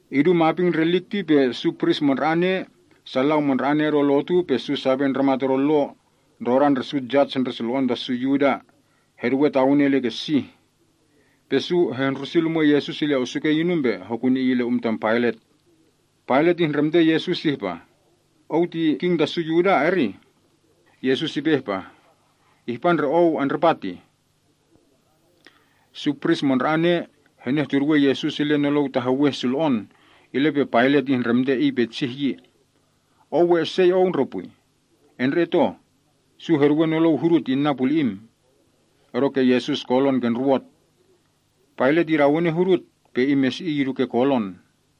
Idu maping ndre lik ti pe su pris mandra‑ane, sa lau mandra‑ane odo lotu, pe su sape ndramat odo lo, ndrodan ndre su jas ndre sulo‑on ta su Yuda, heduwe tawene ile ke sih. Pe su hehndrusi lumwen Yesus ile osukei inum pe hokuni Iy ile um tam Pailat. Pailat ihndremte Yesus ihpah, “Ou ti king ta su Yuda, erih?” Yesus ipe ihpah, “Ihpa ndre Ou andripa tih.” Su pris mandra‑ane henehtuduwen Yesus ile nolou taheweh sulo‑on, ile pe Pailat ihndremte Iy petsih yi, “Ou we esei Ou ndre pwi? Endre‑et oh, su heduwe nolou hudut inna puli‑im.” Odoke Yesus kolon ke ndruwot. Pailat idawene hudut, pe imesi‑iy idu ke kolon.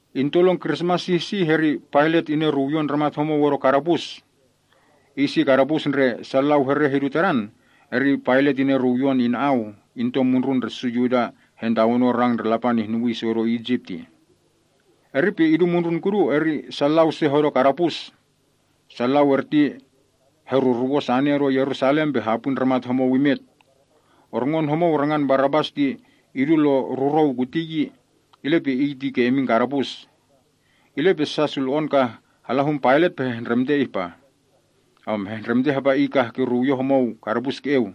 Into lon krismas sih sih, eri Pailat ineruwyon ndramat homou odo kadapus. Iy si kadapus ndre sa lau hereh idu tadan, eri Pailat ineruwyon iy ina‑au, into mundrun ndre su Yuda hantawanon rang ndre Lapan ihnuwii su odo Isip tih. Eri pe idu mundrun kudu, eri sa lau se hodo kadapus. Su lau erti heruruwon sane odo Yerusalam pe hapwi ndramat homou imet. Orngon homou rangan Barabas idu lon rurrou kuti yi, ile pe iy ti ke imin kadapus. Ile pe sa sulo‑on ka hala hun Pailat pe hehndremte, hapa iy kah kiruwyon homou kadapus ke‑eu.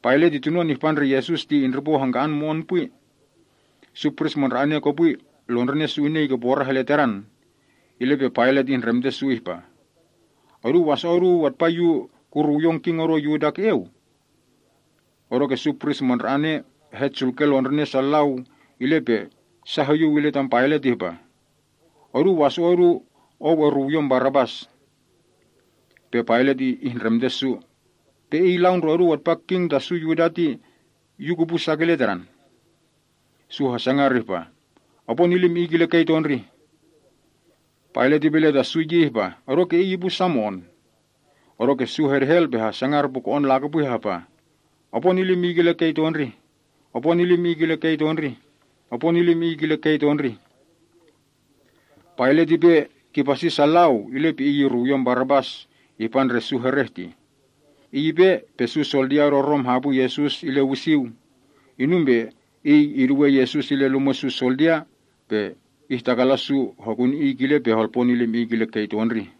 Pailat ti tunon ihpa ndre Yesus ti indripo hangka‑an mo‑on pwi. Su pris mandra‑ane kopwi lon ndrinen su inei ke porah ile Tadan. Ile pe Pailat ihndremte su ihpah, “Oduu waso‑o’ oduu atpa yu kuruwyon king odo Yuda ke‑eu?” Odoke su pris mandra‑ane hetsulke londrine’ sa lau, ile pe sa hoyuw ile tam Pailat ihpah, “Odu waso‑o’ odu ou eruwyon Barabas.” Pe Pailat ihndremte su, “Pe Iy lau ndre oduu atpa king ta su Yuda ti yu kupu sa kile Tadan?” Su hasangar ihpah, “Opo nilim Iy kile kei tondrih!” Pailat ipe ile ta su yi ihpah, “Odoke Iy ipu sa mo‑on?” Odoke su hedehel pe hasangar puko‑on lakopwi ihpah, “Opo nilim Iy kile kei tondrih! Opo nilim Iy kile kei tondrih! Opo nilim Iy kile kei tondrih!” Pailat ipe kipasi sa lau, ile pe iy iruwyon Barabas ihpa ndre su hereh tih. Iy ipe, pe su soldia odo Rom hapwi Yesus ile wisiu. Inum pe iy iduwe Yesus ile lumwe’ su soldia, pe ihtakalan su hokuni Iy kile pe holpo nilim Iy kile kei tondrih.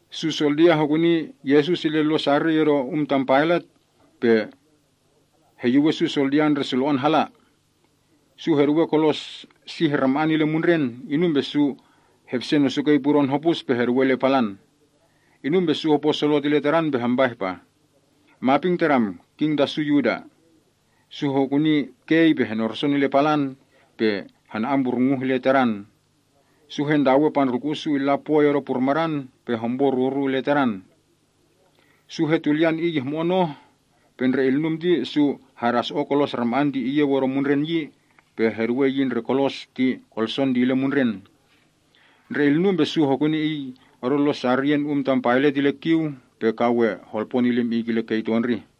Su soldia hokuni Yesus ile lon sariy odo um tam Pailat, pe heyuwen su soldia ndre sulo‑on hala. Su heduwe kolos sih rama‑an ile mundren, inum pe su hepsen osukei pudon hopus pe heduwei ile palan. Inum pe su hoyyuw illa Tadan ihpah, “Maping Tadam, king ta su Yuda!” Su hokuni kei pe heneruson ile palan, pe hena‑amburnguh ile Tadan. Su hentawe pandrulku‑u’ su illa pwoi odo purmadan pe hompo ruru ile Tadan. Su hetulyan Iy ihmo‑on oh, pe ndre ilnum ti su hedaso‑o kolos rama‑an ti iyeu odo mundren yi, pe heduwe yi ndre kolson ti ile mundren. Ndre ilnum pe su hokuni Iy odo lon sariyen um tam Pailat ile kiu, pe ka we holpo nilim Iy kile kei tondrih.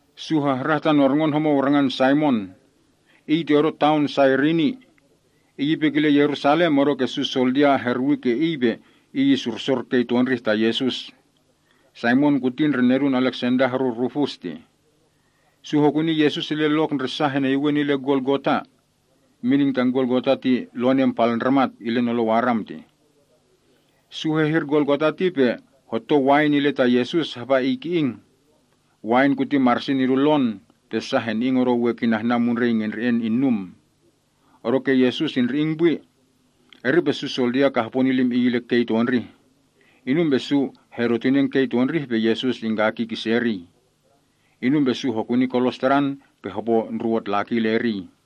Su hahrah tan orngon homou rangan Saimon. Iy ti odo taon Sairini. Iy ipe kile Yerusalem odoke su soldia hehkikiyan iy pe iy isursor kei tondrih ta Yesus. (Saimon kuti ndre nedun Aleksenda horu Rufus tih.) Su hokuni Yesus ile lok ndre sa heneyuwen ile Golgota. Mining tan Golgota ti ‘Ndruhun Palndramat’ ile nolou Aram. Su hehir Golgota ti pe hotou wain ile ta Yesus hapa Iy ki‑ing. Wain kuti marsin idu lon, pe sa heni‑ing odo we kihnan mundrei ngendre‑en kinum. Odoke Yesus indri‑ing pwi. Eri pe su soldia kah hopo nilim Iy ile kei tondrih, inum pe hedotinen idu eleng. Inum pe su hopo ndruwot laki ile kolos Tadan.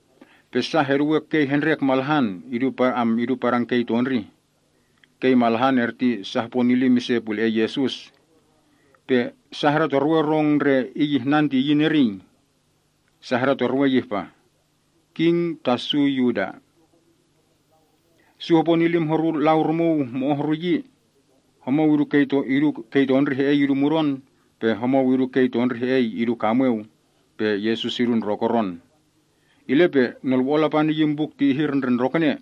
Pe sa heduwe kei hendrek malahan idu padan kei tondrih. Kei malahan erti sa hopo nilim ise pule‑en Yesus. Pe sa hadatorwe rong sa ndre Iy ihnan ti iyin eriy. Sa hadatorwei ihpah, “King Ta Su Yuda.” Sa hopo nilim horu lau rumuu mo‑o’ horu yi. Homou idu kei tondrih he‑ei idu mudon, pe homou idu kei tondrih he‑ei idu kamweu, pe Yesus idu ndrokoron. Ile pe nolwo‑on Lapan iyin buk ti ihir ndre ndrokene.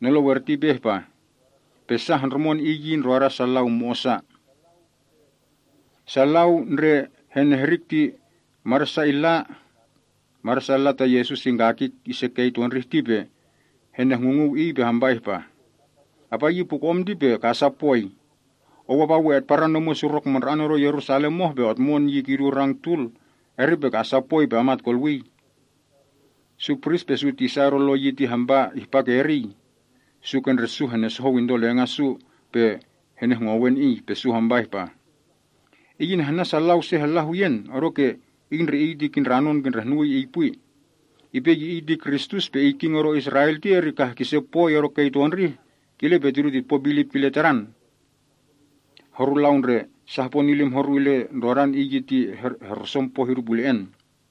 Nolou erti ipe ihpah, “Pe sa hondrumon Iy yi ndroda sa lau mo‑osa!” Sa lau ndre henehrik sal ti madan sa ile ta Yesus ingakik ise kei tondrih ti pe henehngunguu Iy pe hampa ihpah, “Apa yi puko‑om ti ka asa pwoi! Ou apa we etparan omwen surok mandra‑an odo Yerusalem oh pe otmon yi kidu ke rang tul, eri pe ka asa pwoi pe amat kolwii.” Su pris pe su tisa odo Lo yi ti hampa ihpa ke eriy. Su ke ndre su henesohou into lenga’ su pe henehngowen Iy. Pe su hampa ihpa, “Iy inahnan sa lau se hala huyen, odoke Iy ndre Iy ti kindranon kindrehnuwii Iy pwi. Ipe ye Iy ti Kristus pe Iy king odo Israel ti eri kah kise pwoi odo kei tondrih, kile pe tidu titpo bilip kile Tadan.” Horu lau ndre sa hopo nilim horu ile ndrodan Iy ti heruson poh idu pule‑en yi.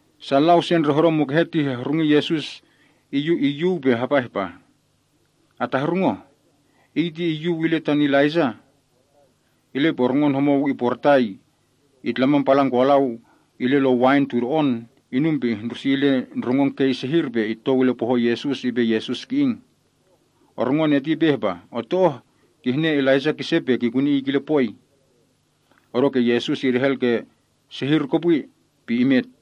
Sa lau se ndre hodo mukehe ti hehrungi Yesus iyuw pe hapa ihpah, “Atahrung oh, Iy ti iyyuw ile tan Elaijah.” Ile pe orngon homou iporitai itlaman palan kolau ile lon wain tudo‑on, inum pe ihndrusi ile palan kei sehir, pe itou ile pohon Yesus, ipe Yesus ki‑ing. Orngon eti ipe ihpa, “Otto oh. Kihne Elaijah kise pe kikuni Iy kile pwoi.” Odoke Yesus idehel sehir kopwi, pe imet.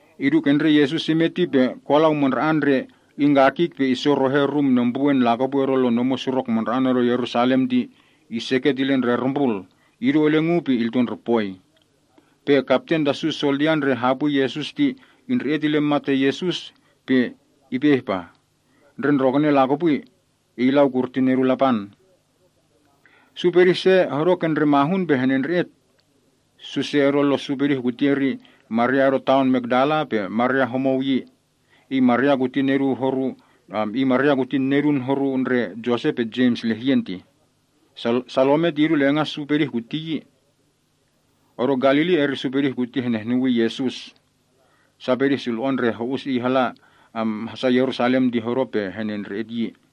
Idu ke ndre Yesus imet ti pe kolau mandra‑an ndre ingkakik pe issorohe rum nembruwen lakopwi odo lon omwen surok mandra‑an odo Yerusalam ti iseket ile ndre rumbrul, idu eleng uu pe ile ndre poi. Pe kapten ta su soldia ndre hapwi Yesus ti indre‑et ile mat ta Yesus ti ipe ihpah, “Ndre ndrokene lakopwi, Iy lau kurti Nedun Lapan!” Su pedih se hodo ke ndre mahun pe henendre‑et. Su se odo lo’ su pedih kuti eri Maria odo taon Makdala, pe Maria homou yi. Iy Maria kuti tinen Josep pe Jems lehyen tih. Salome ti idu lenga’ su pedih kuti yi. Odo Galili, eri su pedih kuti henehnuwii Yesus. Sa pedih sulo‑on ndre ho‑us Iy hasa Yerusalem ti hodo pe henendre‑et yi.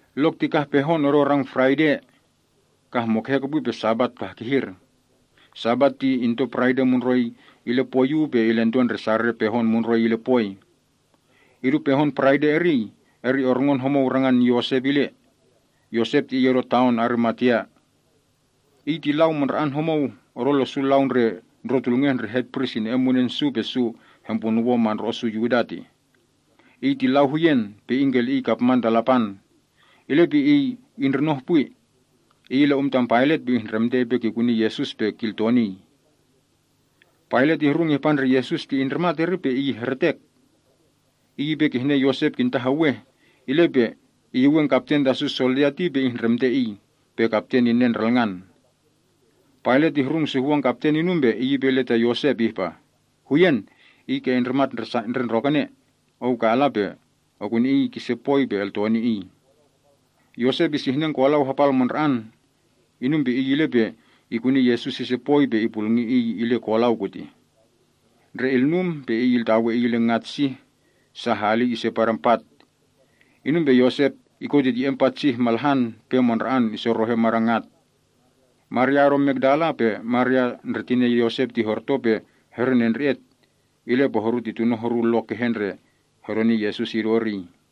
Lok ti kah pehon odo rang Paraide. Kah mukehe kopwi pe Sabat kah kihir. (Sabat ti into Paraide mundroi ile pwoi uu pe ilento ndre Sarere pehon mundroi ile pwoi.) Idu pehon Paraide eriy, orngon homou rangan Yosep ile. Yosep ti iy odo taon Arimatea. Iy ti lau mandra‑an homou odo lo’ su lau ndre ndrotulngeh ndre hetpris ine‑en munen su pe su hempunuwon mandro‑o’ su Yuda tih. Iy ti lau huyen, pe ingkeli‑iy kapman ta Lapan. Ile pe iy indrinoh pwi. Iy ile hun Pailat pe ihndremte ipe kikuni Yesus pe kiltonii. Pailat ihrung ihpa ndre Yesus ti indrimat eri pe iy ihretek. Iy ipe kihne Yosep kintaheweh, ile pe iyuwen kapten ta su soldia ti pe ihndremte iy, pe kapten inen ndralngan. Pailat ihrung suhwon kapten inum pe iy ipe ile ta Yosep ihpah, “Huyen, Iy ke indrimat ndre ndrokene. Ou ka ala pe okuni Iy kise pwoi pe eltoni Iy.” Yosep isihnen kolau hapal mandra‑an. Inum pe iy ile pe ikuni Yesus ise pwoi pe ipulngi Iy ile kolau kutih. Ndre ilnum pe iy iltawe Iy ile ngat sih, sa hali ise padan pat. Inum pe Yosep ikotitye‑en pat hene malahan pe mandra‑an isorohe madan ngat. Maria odo Makdala pe Maria ndre tinen Yosep ti horto pe herenendre‑et, ile pe horu ti tuno’ horu lok kehe ndre hedoni Yesus idu eriy tih.